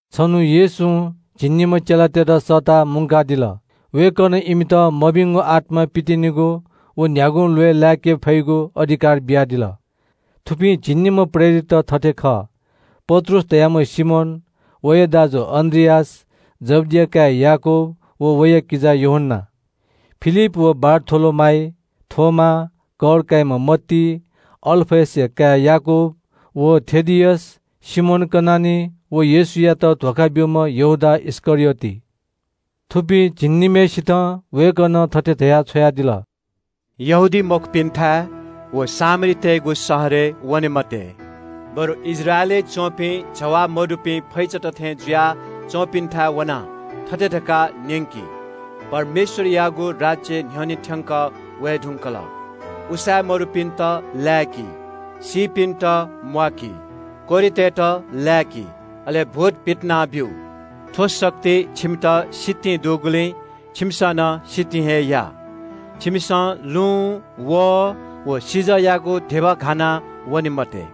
छन्‍हु येशूं झिंनिम्‍ह चेलातय्‌त थःथाय् सःताः इमित मभिंगु आत्‍मा पितिनेगु व न्‍ह्यागुं ल्‍वय् लाय्‌के फइगु अधिकार बियादिल। थुपिं झिंनिम्‍ह प्रेरितत थथे खः – पत्रुस धाःम्‍ह सिमोन, वया किजा अन्‍द्रियास, जब्‍दिया काय् याकूब व वया किजा यूहन्‍ना, फिलिप व बारथोलोमाइ, थोमा, कर काइम्‍ह मत्ती, अल्‍फयसया काय् याकूब व थेदियस, सिमोन कनानी व येशूयात धोखा ब्‍यूम्‍ह यहूदा इस्‍करियोत। थुपिं झिंनिम्‍हय्‌सितं वय्‌कलं थथे धयाः छ्वयादिल – “यहूदीमखुपिन्‍थाय् व सामरीतय्‌गु शहरय् वने मते। बरु इस्राएलय् च्‍वंपिं जवाः मदुपिं फैचात थें जुया च्‍वंपिन्‍थाय् वनाः थथे धकाः न्‍यंकि – ‘परमेश्‍वरयागु राज्‍य न्‍ह्यःने थ्‍यंकः वये धुंकल।’ उसाँय् मदुपिन्‍त लाय्‌कि, सीपिन्‍त म्‍वाकी, कोह्रितय्‌त लाय्‌कि, अले भूत पितिनाछ्व। थ्‍व शक्ति छिमित सितिं दुगुलिं छिमिसं नं सितिं हे या। “छिमिसं लुँ, वहः व सिजःयागु धिबा घाना वने मते।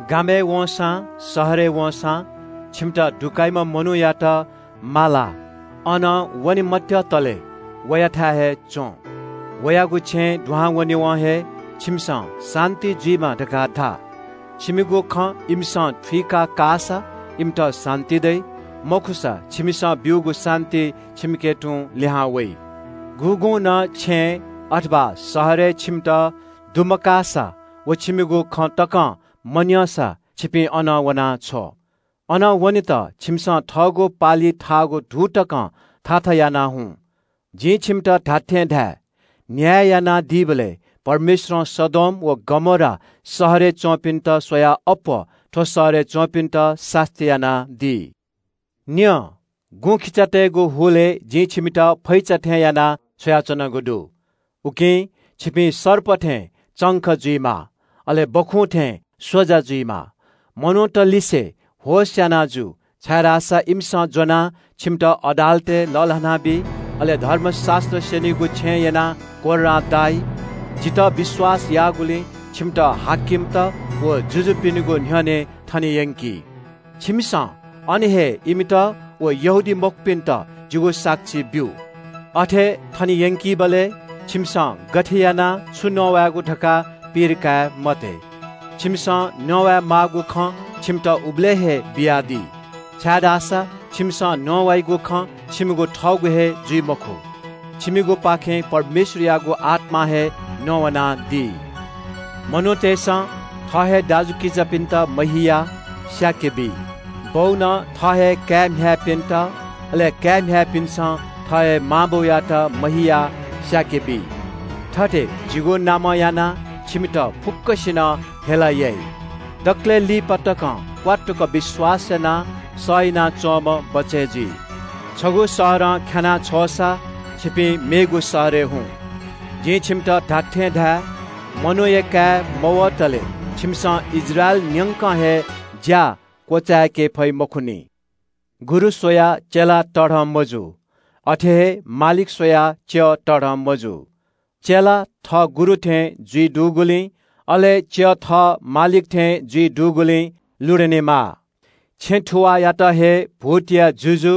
“गामय् वंसां शहरय् वंसां छिमित दुकाइम्‍ह मनूयात मालाः अनं वने मत्‍यतले वयाथाय् हे च्‍वँ। वयागु छेँय् दुहां वनेवं हे ‘छिमित शान्‍ति दयेमा’ धकाः धा। छिमिगु खँ इमिसं थुइका काःसा इमित शान्‍ति दइ, मखुसा छिमिसं ब्‍यूगु शान्‍ति छिमिके तुं लिहां वइ। गुगुं नं छेँय् अथवा शहरय् छिमित दुमकाःसा व छिमिगु खँ तकं मन्‍यंसा छिपिं अनं वनाछ्व। अनं वनेत छिमिसं थःगु पालिइ थाःगु धू तकं थाथा यानाः हुँ। जिं छिमित खःगु खँ धाये – न्‍याय यानादीबलय् परमेश्‍वरं सदोम व गमोरा शहरय् च्‍वंपिन्‍त स्‍वयाः अप्‍वः थ्‍व शहरय् च्‍वंपिन्‍त सास्‍ती यानादी।” “न्‍यँ, गुँखिचातय्‌गु हुलय् जिं छिमित फैचा थें यानाः छ्वयाच्‍वनागु दु। उकिं छिपिं सर्प थें चंख जुइमाः, अले सुकुभतु थें स्‍वजा जुइमाः। मनूतलिसे होश याना जु, छाय्‌धाःसा इमिसं ज्‍वनाः छिमित अदालतय् लःल्‍हानाबी। अले धर्मशास्‍त्र स्‍यनीगु छेँय् यनाः कोर्रां दाइ। जितः विश्‍वास याःगुलिं छिमित हाकिमत व जुजुपिनिगु न्‍ह्यःने थने यंकी। छिमिसं अन हे इमित व यहूदीमखुपिन्‍त जिगु साक्षी ब्‍यु। अथे थने यंकीबलय् छिमिसं गथे यानाः छु नवायेगु धकाः धन्‍धा काये मते। छिमिसं नवाये माःगु खँ छिमित उबलय् हे बियादी। छाय्‌धाःसा छिमिसं नवाइगु खँ छिमिगु थःगु हे जुइ मखु, छिमिगुपाखें परमेश्‍वरयागु आत्‍मां हे नवानादी। “मनूतय्‌सं थः हे दाजुकिजापिन्‍त महियाः स्‍याके बी। बौनं थः हे काय् म्‍ह्याय्‌पिन्‍त, अले काय् म्‍ह्याय्‌पिन्‍सं थः हे मां बौयात महियाः स्‍याके बी। थथे जिगु नामं यानाः छिमित फुक्‍कसिनं हेला याइ। दकलय् लिपा तकं क्‍वात्तुक विश्‍वास यानाः सह यानाच्‍वंम्‍ह बचय् जुइ। छगू शहरं ख्‍यानाः छ्वःसां छिपिं मेगु शहरय् हुँ। जिं छिमित धात्‍थें धाये – मनूया काय् मवतले छिमिसं इस्राएल न्‍यंक हे ज्‍या क्‍वचाय्‌के फइ मखुनि।” “गुरु स्‍वयाः चेला तःधं मजू। अथे हे मालिक स्‍वयाः च्‍यः तःधं मजू। चेला थः गुरु थें जुइ दुगुलिं, अले च्‍यः थः मालिक थें जुइ दुगुलिं लुधनेमाः। छेँ थुवाःयात हे भूतया जुजु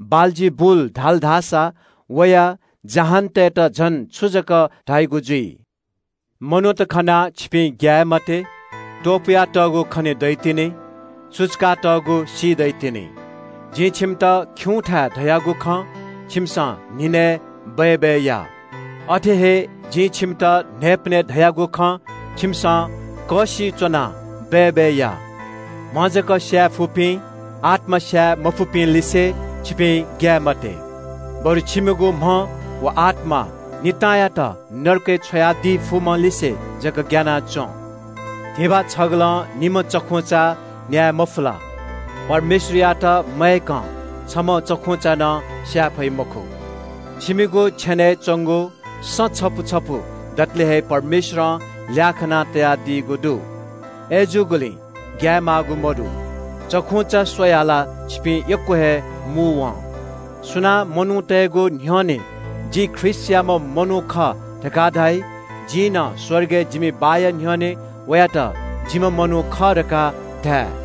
बालजिबुल धाल धाःसा वया जहानतय्‌त झन छु जक धाइगु जुइ?” सु खनाः ग्‍यायेमाः? “मनूत खनाः छिपिं ग्‍याये मते। त्‍वपुयातःगु खने दइतिनि। सुचुकातःगु सी दइतिनि। जिं छिमित खिउँथाय् धयागु खँ छिमिसं न्‍हिनय् बय्‌बय् या। अथे हे जिं छिमित न्‍हाय्‌पनय् धयागु खँ छिमिसं कःसिइ च्‍वनाः बय्‌बय् या। “म्‍ह जक स्‍याये फुपिं, आत्‍मा स्‍याये मफुपिंलिसे छिपिं ग्‍याये मते। बरु छिमिगु म्‍ह व आत्‍मा नितांयात नरकय् छ्वयादी फुम्‍हलिसे जक ग्‍याना च्‍वँ। धिबा छगलं निम्‍ह चखुंचा न्‍याये मफु ला? परमेश्‍वरयात मयय्‌कं छम्‍ह चखुंचा नं स्‍याये फइ मखु। छिमिगु छेनय् च्‍वंगु सँ छपु छपु दतले हे परमेश्‍वरं ल्‍याः खाना तयादीगु दु। अय्‌जूगुलिं ग्‍याये माःगु मदु। चखुंचा स्‍वयाः ला छिपिं यक्‍व हे मू वं।” “सुनां मनूतय्‌गु न्‍ह्यःने ‘जि ख्रीष्‍टयाम्‍ह मनू खः’ धकाः धाइ, जिं नं स्‍वर्गय् जिमि बाःया न्‍ह्यःने वयात ‘जिम्‍ह मनू खः’ धकाः धाये।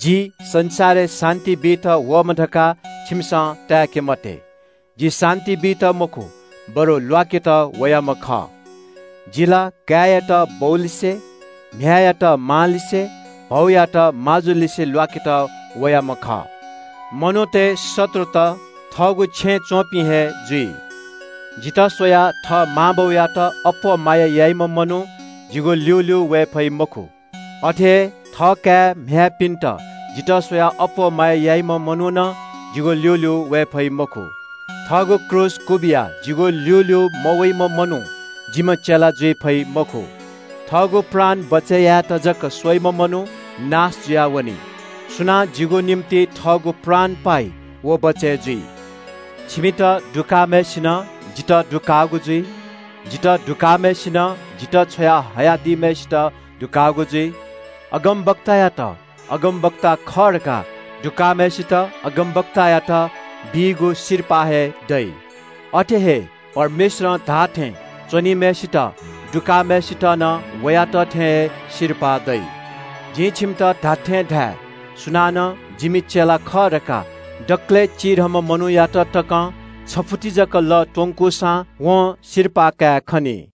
“जि संसारय् शान्‍ति बीत वःम्‍ह धकाः छिमिसं ताय्‌के मते। जि शान्‍ति बीत मखु, बरु ल्‍वाकेत वयाम्‍ह खः। “‘जि ला काय्‌यात बौलिसे, म्‍ह्याय्‌यात मांलिसे, भौयात माजुलिसे ल्‍वाकेत वयाम्‍ह खः। मनूतय् शत्रुत थःगु छेँय् च्‍वंपिं हे जुइ।’ “जितः स्‍वयाः थः मां बौयात अप्‍वः माया याइम्‍ह मनू जिगु ल्‍यूल्‍यू वये फइ मखु। अथे हे थःकाय् म्‍ह्याय्‌पिन्‍त जितः स्‍वयाः अप्‍वः माया याइम्‍ह मनू नं जिगु ल्‍यूल्‍यू वये फइ मखु। थःगु क्रूस क्‍वबिया जिगु ल्‍यूल्‍यू मवइम्‍ह मनू जिम्‍ह चेला जुइ फइ मखु। थःगु प्राण बचय् यायेत जक स्‍वइम्‍ह मनू नाश जुयावनी। सुनां जिगु निंतिं थःगु प्राण पाइ व बचय् जुइ।” “छिमित दुकाःम्‍हय्‌सिनं जितः दुकाःगु जुइ। जितः दुकाःम्‍हय्‌सिनं जितः छ्वया हयादीम्‍हय्‌सित दुकाःगु जुइ। अगमवक्तायात अगमवक्ता खः धकाः दुकाःम्‍हय्‌सित अगमवक्तायात बीगु सिरपाः हे दइ। अथे हे परमेश्‍वरं धाःथें च्‍वनीम्‍हय्‌सित दुकाःम्‍हय्‌सित नं वयात थें हे सिरपाः दइ। जिं छिमित खःगु खँ धाये – सुनानं जिमि चेला खः धकाः दकलय् चिधंम्‍ह मनूयात तकं छगू गिलास जक लः त्‍वंकूसां वं सिरपाः कायेखनी।”